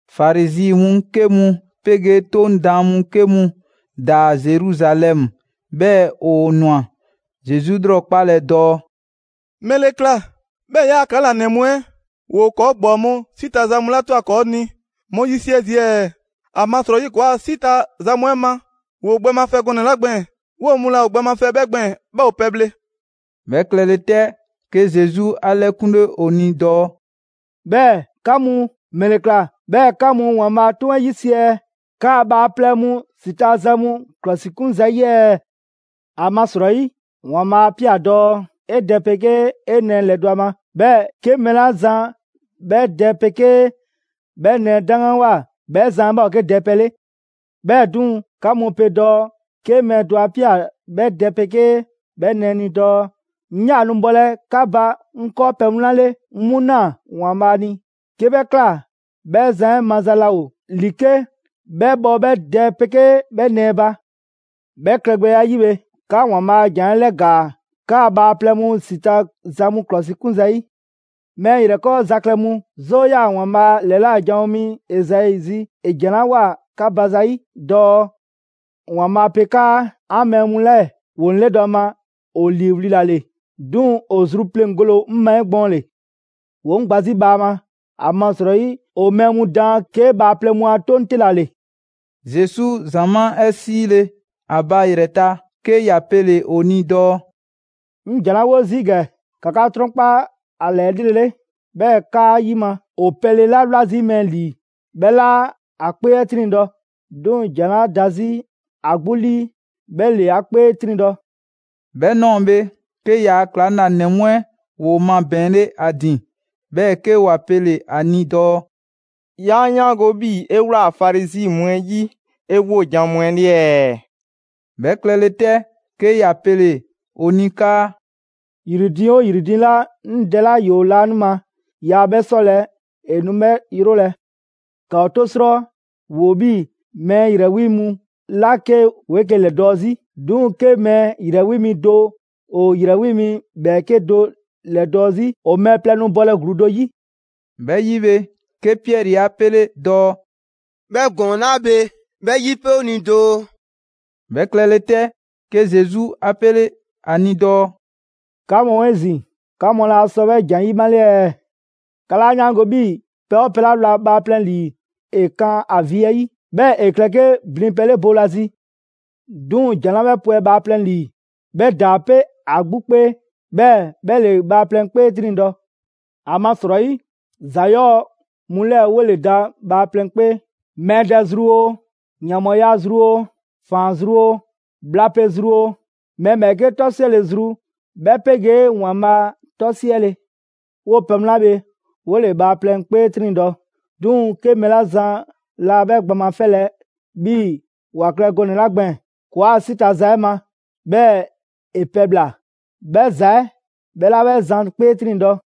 Farizi mu 'ke mu 'pegee 'Toŋ daan mu 'ke mu ‑daa Zeruzalɛmu, 'bhɛɛ‑ ‑o ꞊nwa Zesu 'lrɔkpalɛ dɔɔ: «‑Mɛle ꞊kla 'bhɛɛ‑ 'yaa‑ ‑klaŋlanɛ mu 'ɛ ‑woo ‑kɔɔ' ‑gbɔɔ mu 'si ta za mu 'la ꞊twa ‑kɔɔ' ni 'mu 'yisiɛ zii' ɛɛ? ‑Amasrɔyi ‑kɔɔa' 'si ta za mu 'ɛ ma, ‑woo gbɛ mafɛ gɔnɛ‑ 'la gbɛɛn‑, 'woo‑ mu laa ‑o gbɛ mafɛ 'bhɛ gbɛɛn‑, 'bhɛɛ‑ ‑o pɛbhle.» 'Bhɛ klɛle 'tɛ, 'ke Zesu 'a 'lɛkunle ‑o ni dɔɔ: «'Bhɛɛ‑ 'ka mu, ‑mɛle ꞊kla 'bhɛɛ‑ 'ka mu ‑Waanbhaa' a 'toŋ 'ɛ 'yisiɛ‑ 'kaa bhaaplɛŋ mu ‑si ta za mu ‑klɔsikun zayi' ɛɛ? ‑Amasrɔyi, ‑Waanbhaa' 'a ꞊pia dɔɔ: ‹'E dɛ 'pegee 'e nɛɛ ‑lɛdɔ' ‑a ma, 'bhɛɛ‑ 'ke mɛɛ 'la zan 'bhɛ dɛ 'pegee 'bhɛ nɛɛ 'daŋganwoa 'bhɛ zan 'ɛ 'bhɛ ‑o 'ke dɛpɛ 'le.› 'Bhɛɛ‑ 'duŋ‑, 'ka mu pe dɔɔ 'ke mɛɛ do 'a ꞊pia 'bhɛ dɛ 'pegee 'bhɛ nɛɛ ni dɔɔ: ‹'Ŋ 'yaa‑ nu bhɔlɛ 'ka ba 'ŋ 'kɔɔpɛ‑ mu 'la 'le, 'ŋ 'mu ꞊naa ‑Waanbhaa' ni›, 'ke 'bhɛ ꞊kla, 'bhɛ zan 'ɛ maza laa ‑o ‑li 'ke 'bhɛ bhɔ 'bhɛ dɛ 'pegee 'bhɛ nɛɛ ba. 'Bhɛ klɛgbɛya 'ɛ 'yi bhe, 'ka ‑Waanbhaa' a ‑jan 'ɛ 'lɛgaa‑ 'kaa‑ bhaaplɛŋ mu 'si ta za mu ‑klɔsikun zayi'. Mɛɛ ‑yrɛkɔɔza klɛ mu! 'Zoo 'yaa‑ ‑Waanbhaa' ‑lɛla' janwo mi Ezai zi ‑e ‑jan 'la ꞊woa 'ka ba zayi' dɔɔ: ‑Waanbhaa' pe 'kaa: ‹'An mɛɛ mu 'lɛɛ‑ ‑woo 'ŋ 'lɛdɔ‑ a ma ‑o ‑liiwli' ‑la ‑le. 'Duŋ‑ ‑o zru pleŋgole ‑o 'ŋ ma 'egbɔɔnle. ‑Woo 'ŋ gba 'zi bhaama, ‑amasrɔyi ‑o mɛɛ mu daan 'ke bhaaplɛŋ mu a 'toŋ 'te ‑la ‑le.›» Zesu ‑zamaa' 'ɛ 'siile ‑a ba ‑yrɛ ta, 'ke ‑ya pele‑ ‑o ni dɔɔ: «'Ŋ ‑jan 'la 'wo zii' ‑gɛ, ‑ka 'ka 'trɔnkpa 'a ‑la 'elrele, 'bhɛɛ‑ ‑kaa ‑yima': ‑O pelɛ 'la 'wla zii' mɛɛ ‑lii, 'bhɛ 'laa 'a 'kpee 'ɛ 'triŋdɔ‑, 'duŋ‑ ‑jan 'la da 'zi ‑a 'gbu 'lii 'bhɛ ‑le ‑a 'kpee 'triŋdɔ‑.» 'Bhɛ ꞊nɔɔ bhe, 'ke ‑yaa' ‑klaŋlanɛ mu 'ɛ ‑woo mabɛɛnle ‑a ‑din, 'bhɛɛ‑ 'ke ‑wa pele‑ ‑a ni dɔɔ: «'Ya 'yaango‑ 'bhii‑ 'e ꞊wlaa Farizi mu 'ɛ 'yi 'e 'wojan‑ mu 'ɛ 'le ɛɛ?» 'Bhɛ klɛle 'tɛ, 'ke ‑ya pele‑ ‑o ni 'kaa: «‑Yri diiŋ 'oo ‑yri diiŋ 'la 'ŋ Dɛ 'la ‑yoo laanima yaa 'bhɛ 'sɔlɛ‑, ‑e nu 'bhɛ 'yrolɛ‑. ‑Ka ‑o 'to 'srɔ: ‑Woo 'bhii‑ mɛɛ ‑yrɛ 'wi mu 'la 'ke ‑woo 'eke‑ ‑lɛdɔɔ' 'zi. 'Duŋ‑ 'ke mɛɛ ‑yrɛ 'wi mi do ‑o ‑yrɛ 'wi mi ‑bhɛɛke' do ‑lɛdɔɔ' 'zi, ‑o mɛɛ plɛ nu bɔlɛ ‑gluu do 'yi.» 'Bhɛ 'yi bhe, 'ke Piɛri 'a 'pele dɔɔ: «'Bhɛ ‑gɔɔn 'la bhe, 'bhɛ 'yipe 'o ni doo.» 'Bhɛ klɛle 'tɛ, 'ke Zesu 'a 'pele 'a ni dɔɔ: «'Ka mu 'ezin‑, 'ka mu 'laa sɔ 'bhɛ ‑jan 'ɛ 'yimale ɛɛ? 'Ka 'laa 'yaango‑ 'bhii‑ pɛ 'oo pɛ 'la wla bhaaplɛŋ ‑lii ‑e 'kan ‑a vi 'ɛ 'yi, 'bhɛɛ‑ ‑e klɛ 'ke blinpɛ 'le boolazi. 'Duŋ‑, ‑jan 'la 'bhɛ pwɛ bhaaplɛŋ ‑lii, 'bhɛ ‑daa 'pe ‑a 'gbu 'kpee, 'bhɛɛ‑ 'bhɛ ‑le bhaaplɛŋ 'kpee 'triŋdɔ‑. ‑Amasrɔyi, ‑za 'yɔɔ‑ mu 'lɛɛ‑ 'wole‑ da bhaaplɛŋ 'kpee: Mɛɛ dɛ zru oo, ‑yanbhɔɔya zru oo, ‑faan zru oo, bhla pe zru oo, mɛɛ ‑bhɛɛke' 'tɔsiɛle zru, 'bhɛ 'pegee ‑Waanbhaa 'tɔsiɛle. 'Woo pɛ mu 'la bhe 'wole‑ bhaaplɛŋ 'kpee 'triŋdɔ‑; 'duŋ‑ 'ke mɛɛ 'la zan laa 'bhɛ gbɛ mafɛlɛ 'bhii‑ ‑wa klɛ gɔnɛ‑ 'la gbɛɛn‑ ‑kɔɔa' 'si ta za 'ɛ ma, 'bhɛɛ‑ ‑e pɛbhla‑; 'bhɛ ‑za 'ɛ 'bhɛ 'laa 'bhɛ zan 'kpee 'triŋdɔ‑.»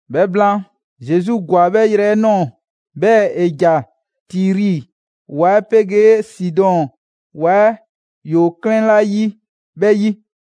'Bhɛ blaan, Zesu ‑gwa 'bhɛ yrɛ 'ɛ ꞊nɔɔ, 'bhɛɛ‑ ‑e ‑ja Tiri ‑wa 'ɛ 'pegee Sidɔn ‑wa 'ɛ ‑woo 'klɛɛn 'la 'yi 'bhɛ 'yi.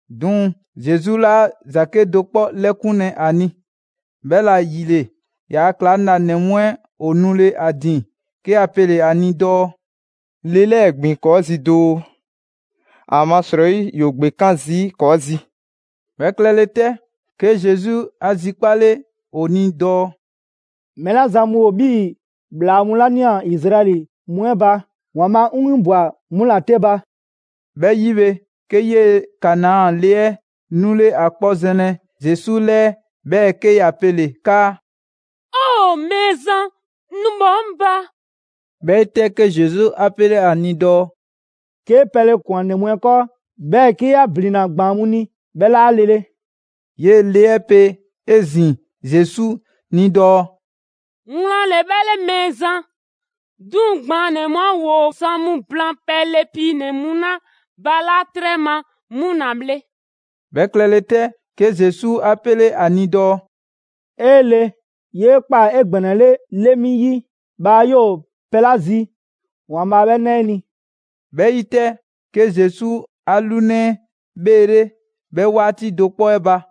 'Duŋ‑ Zesu 'laa ‑za 'kedo‑ 'kpɔ 'lɛkunlɛ a ni. 'Bhɛla‑ ‑yile, ‑yaa' ‑klaŋlanɛ mu 'ɛ ‑o nule‑ ‑a ‑din, 'ke ‑wa pele‑ ‑a ni dɔɔ: «Le 'lɛɛ‑ ‑gbin ‑kɔɔ' 'zi doo, ‑amasrɔyi ‑yoo ‑gbekan' zii' ‑kɔɔ' zi.» 'Bhɛ klɛle 'tɛ, 'ke Zesu 'a zikpale ‑o ni dɔɔ: «Mɛɛ 'la zan mu ‑o 'bhii‑ ‑bhlaa mu 'la ꞊nia Izraɛli mu 'ɛ ba ‑Waanbhaa' 'ŋ 'winbwa‑ 'mu ‑la 'te ba.» 'Bhɛ 'yi bhe, 'ke 'yee‑ Kanaa le 'ɛ 'nule ‑a 'kpɔ zɛnlɛ Zesu 'lɛɛ, 'bhɛɛ‑ 'ke ‑ya pele‑ 'kaa: «Mɛɛzan, nu bhɔ 'ŋ ba!» 'Bhɛ 'yi 'tɛ, 'ke Zesu 'a 'pele ‑a ni dɔɔ: «'Kee pɛle ꞊kwan ‑nɛ mu 'ɛ 'kɔɔ, 'bhɛɛ‑ 'ke ‑ya ‑blinna ‑gbaan' mu ni, 'bhɛ 'laa lele.» 'Yee‑ le 'ɛ pe 'ezin‑ Zesu ni dɔɔ: «Wlan ‑le 'bhɛ 'le Mɛɛzan, 'duŋ‑ ‑gbaannɛ mu 'ɛ ‑woo zan mu blaan pɛle piinɛ‑ mu 'la ‑balaa' 'trɛ ma 'mu ‑la bhle!» 'Bhɛ klɛle 'tɛ, 'ke Zesu 'a 'pele ‑a ni dɔɔ: «'E le! 'Yee ꞊kpaa 'egbɛnɛle 'le mi 'yi! Bhaa 'yoo‑ pɛ 'la zi, ‑Waanbhaa' 'bhɛɛ‑ 'na 'e ni.» 'Bhɛ 'yi 'tɛ, 'ke Zesu 'a 'lunɛ 'ɛ bheele' 'bhɛ 'waati do 'kpɔ 'ɛ ba.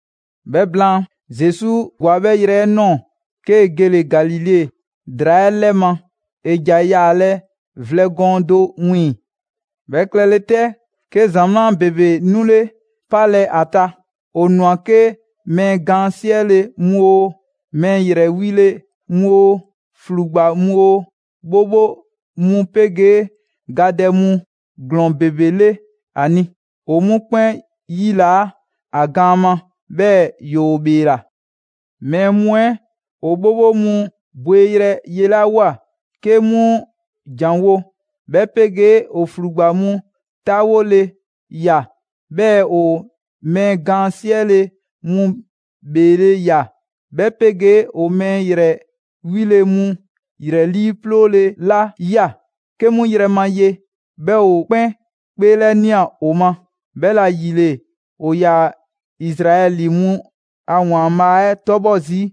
'Bhɛ blaan, Zesu ‑gwa 'bhɛ yrɛ 'ɛ ꞊nɔɔ, 'kee‑ gele‑ Galile ‑draa 'ɛ 'lɛ ma. ‑E ‑ja yaalɛ vlɛ gɔɔn do 'wiiŋ‑. 'Bhɛ klɛle 'tɛ, 'ke ‑zamaa' ‑bebe 'nule‑ 'palɛ‑ ‑a ta. ‑O ꞊nwa 'ke mɛɛ gaan 'siɛle‑ mu oo, mɛɛ ‑yrɛ 'wile‑ mu oo, ‑flugba mu oo, 'bhobho mu 'pegee gadɛ mu ‑glɔɔn ‑bebe 'le ‑a ni. ‑O 'mu 'kpɛn 'yilaa‑ ‑a gaan ma, 'bhɛɛ‑ ‑yoo ‑bheela. Mɛɛ mu 'ɛ ‑o 'bhobho mu ‑bheeyrɛ' yelawoa 'ke 'mu ‑janwo', 'bhɛ 'pegee ‑o ‑flugba mu 'taawole ꞊ya, 'bhɛɛ‑ ‑o mɛɛ gaan 'siɛle‑ mu ‑bheele' ꞊ya, 'bhɛ 'pegee ‑o mɛɛ ‑yrɛ 'wile‑ mu ‑yrɛ 'liiplooyrɛ 'la ꞊ya 'ke 'mu yrɛ ma ye, 'bhɛ ‑o 'kpɛn 'kpeelɛnia ‑o ma. 'Bhɛla‑ ‑yile, ‑o ‑yaa Izraɛli mu a ‑Waanbhaa' 'ɛ 'tɔbhɔ zii'.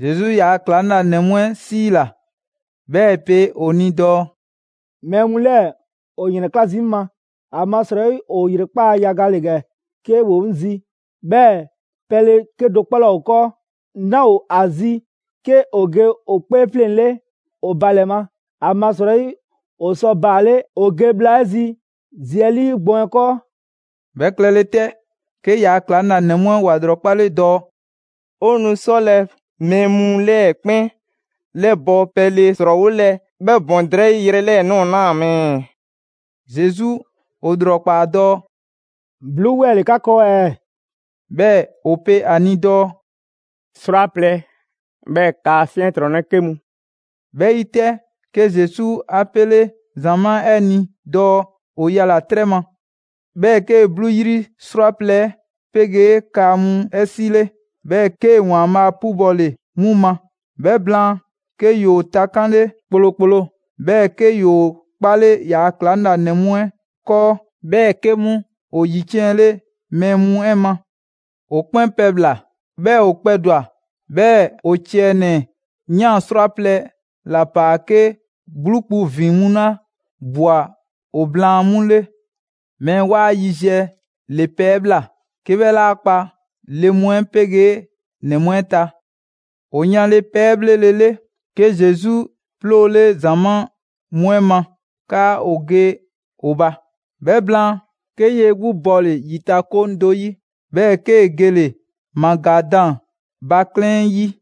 Zesu ‑yaa' ‑klaŋlanɛ mu 'ɛ 'siila‑, 'bhɛɛ‑ ‑e pe ‑o ni dɔɔ: «Mɛɛ mu 'lɛɛ‑ ‑o ‑yrɛnkla' zii' 'ŋ ma, ‑amasrɔyi ‑o ‑yrekpaa' yaga ‑le ‑gɛ 'ke ‑woo 'ŋ zi, 'bhɛɛ‑ pɛle 'kedo‑ 'kpɔ 'laa ‑o 'kɔɔ. 'Naa ‑o ‑a zi 'ke ‑o ge ‑o 'kpee 'fleŋ‑ 'le ‑o ba ‑lɛ ma. ‑Amasrɔyi ‑o sɔ baale' ‑o ge bhla 'ɛ zi zi 'ɛ 'lii gbɔn 'ɛ 'kɔɔ.» 'Bhɛ klɛle 'tɛ, 'ke ‑yaa' ‑klaŋlanɛ mu 'ɛ ‑wa ‑lrɔkpale dɔɔ: «'O nu 'sɔlɛ‑ mɛɛ mu 'lɛɛ‑ 'kpɛn 'lɛbɔ‑ pɛle ‑srɔɔwolɛ 'bhɛ ‑bɔn drɛyi' yrɛ 'lɛɛ‑ ꞊nɔɔ 'naa‑ ma ɛɛ?» Zesu ‑o ‑lrɔkpaa dɔɔ: «'bluu 'wɛɛ‑ ‑le 'ka 'kɔɔ ɛɛ?» 'Bhɛɛ‑ ‑o pe ‑a ni dɔɔ: «'Srwaplɛ‑, 'bhɛɛ‑ kaa 'fiɛntrɔnnɛ 'ke mu.» 'Bhɛ 'yi 'tɛ, 'ke Zesu 'a 'pele ‑zamaa' 'ɛ ni dɔɔ ‑o yala‑ 'trɛ ma. 'Bhɛɛ‑ 'kee‑ 'bluu 'yri 'srwaplɛ‑ 'ɛ 'pegee kaa mu 'ɛ 'sile, 'bhɛɛ‑ 'kee‑ ‑Waanbhaa' 'pubɔle 'mu ma. 'Bhɛ blaan, 'ke ‑yoo takanle kplokplo, 'bhɛɛ‑ 'ke ‑yoo 'kpale ‑yaa' ‑klaŋlanɛ mu 'ɛ 'kɔɔ‑, 'bhɛɛ‑ 'ke 'mu ‑o ‑yiciɛnle mɛɛ mu 'ɛ ma. ‑O 'kpɛn pɛbhla‑, 'bhɛɛ‑ ‑o kpɛdwa‑. 'Bhɛɛ‑ ‑o ciɛ ‑nɛ ꞊yan 'srwaplɛ‑ ‑la ‑paa 'ke 'bluu kpu ‑vin mu 'la ꞊bwa ‑o blaan 'mu 'le. Mɛɛ 'waa yiziɛ ‑le pɛ 'ɛ ꞊bhla, 'ke 'bhɛ 'laa kpa le mu 'ɛ 'pegee ‑nɛ mu 'ɛ ta. ‑O yanle pɛ 'ɛ 'bhlelele, 'ke Zesu 'ploole ‑zamaa' mu 'ɛ ma 'kaa ‑o ge ‑o ba. 'Bhɛ blaan, 'ke 'yee‑ 'gbu bɔle‑ ‑yitakoŋ do 'yi, 'bhɛɛ‑ 'kee‑ gele‑ Magadan ba 'klɛɛn 'ɛ 'yi.